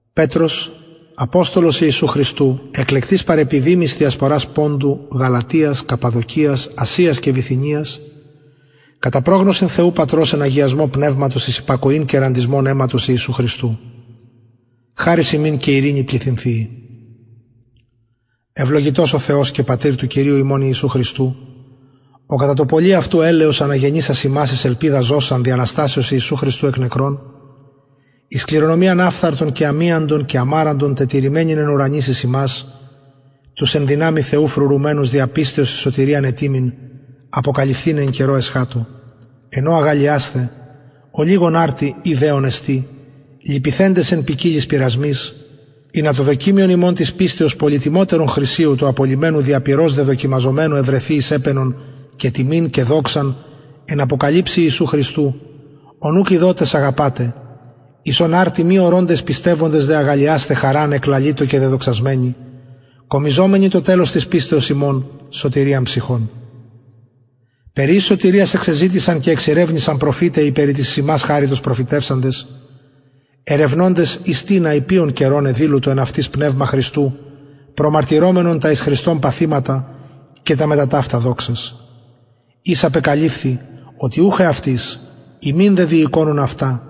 πετρος αποστολος ιησου χριστου εκλεκτοις παρεπιδημοις διασπορας ποντου γαλατιας καππαδοκιας ασιας και βιθυνιας κατα προγνωσιν θεου πατρος εν αγιασμω πνευματος εις υπακοην και ραντισμον αιματος ιησου χριστου χαρις υμιν και ειρηνη πληθυνθειη ευλογητος ο θεος και πατηρ του κυριου ημων ιησου χριστου ο κατα το πολυ αυτου ελεος αναγεννησας ημας εις ελπιδα ζωσαν δι αναστασεως ιησου χριστου εκ νεκρων εις κληρονομιαν αφθαρτον και αμιαντον και αμαραντον τετηρημενην εν ουρανοις εις υμας τους εν δυναμει θεου φρουρουμενους δια πιστεως εις σωτηριαν ετοιμην αποκαλυφθηναι εν καιρω εσχατω εν ω αγαλλιασθε ολιγον αρτι ει δεον εστιν λυπηθεντες εν ποικιλοις πειρασμοις ινα το δοκιμιον υμων της πιστεως πολυ τιμιωτερον χρυσιου του απολλυμενου δια πυρος δε δοκιμαζομενου ευρεθη εις επαινον και τιμην και εις δοξαν εν αποκαλυψει ιησου χριστου ον ουκ ειδοτες αγαπατε εις ον αρτι μη ορωντες πιστευοντες δε αγαλλιασθε χαρα ανεκλαλητω και δεδοξασμενη κομιζομενοι το τελος της πιστεως υμων σωτηριαν ψυχων περι ης σωτηριας εξεζητησαν και εξηρευνησαν προφηται οι περι της εις υμας χαριτος προφητευσαντες ερευνωντες εις τινα η ποιον καιρον εδηλου το εν αυτοις πνευμα χριστου προμαρτυρομενον τα εις χριστον παθηματα και τας μετα ταυτα δοξας οις απεκαλυφθη οτι ουχ εαυτοις υμιν δε διηκονουν αυτα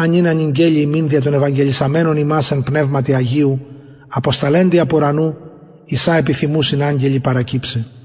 α νυν ανηγγελη υμιν δια των ευαγγελισαμενων υμας εν πνευματι αγιω αποσταλεντι απ ουρανου εις α επιθυμουσιν αγγελοι παρακυψαι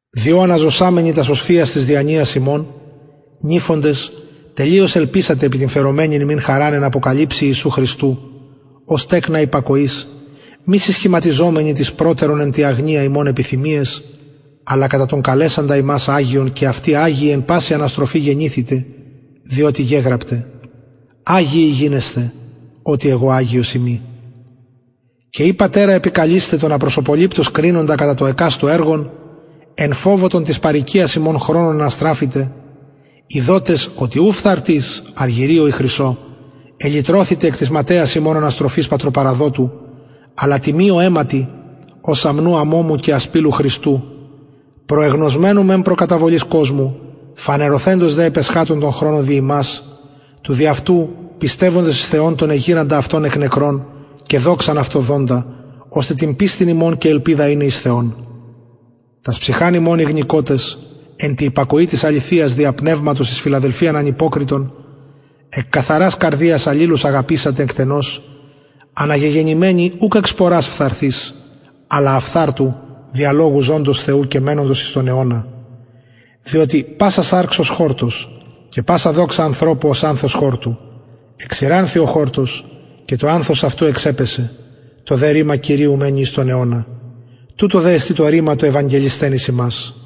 διο αναζωσαμενοι τας οσφυας της διανοιας υμων νηφοντες τελειως ελπισατε επι την φερομενην υμιν χαριν εν αποκαλυψει ιησου χριστου ως τεκνα υπακοης μη συσχηματιζομενοι ταις προτερον εν τη αγνοια υμων επιθυμιαις αλλα κατα τον καλεσαντα υμας αγιον και αυτοι αγιοι εν παση αναστροφη γενηθητε διοτι γεγραπται αγιοι γινεσθε οτι εγω αγιος ειμι και ει πατερα επικαλεισθε τον απροσωποληπτως κρινοντα κατα το εκαστου εργον εν φοβω τον της παροικιας υμων χρονον αναστραφητε ειδοτες οτι ου φθαρτοις αργυριω η χρυσιω ελυτρωθητε εκ της ματαιας υμων αναστροφης πατροπαραδοτου αλλα τιμιω αιματι ως αμνου αμωμου και ασπιλου χριστου προεγνωσμενου μεν προ καταβολης κοσμου φανερωθεντος δε επ εσχατων των χρονων δι υμας τους δι αυτου πιστευοντας εις θεον τον εγειραντα αυτον εκ νεκρων και δοξαν αυτω δοντα ωστε την πιστιν υμων και ελπιδα ειναι εις θεον τας ψυχας υμων ηγνικοτες εν τη υπακοη της αληθειας δια πνευματος εις φιλαδελφιαν ανυποκριτον εκ καθαρας καρδιας αλληλους αγαπησατε εκτενως αναγεγεννημενοι ουκ εκ σπορας φθαρτης αλλα αφθαρτου δια λογου ζωντος θεου και μενοντος εις τον αιωνα διοτι πασα σαρξ ως χορτος και πασα δοξα ανθρωπου ως ανθος χορτου εξηρανθη ο χορτος και το ανθος αυτου εξεπεσεν το δε ρημα κυριου μενει εις τον αιωνα τουτο δε εστιν το ρημα το ευαγγελισθεν εις υμας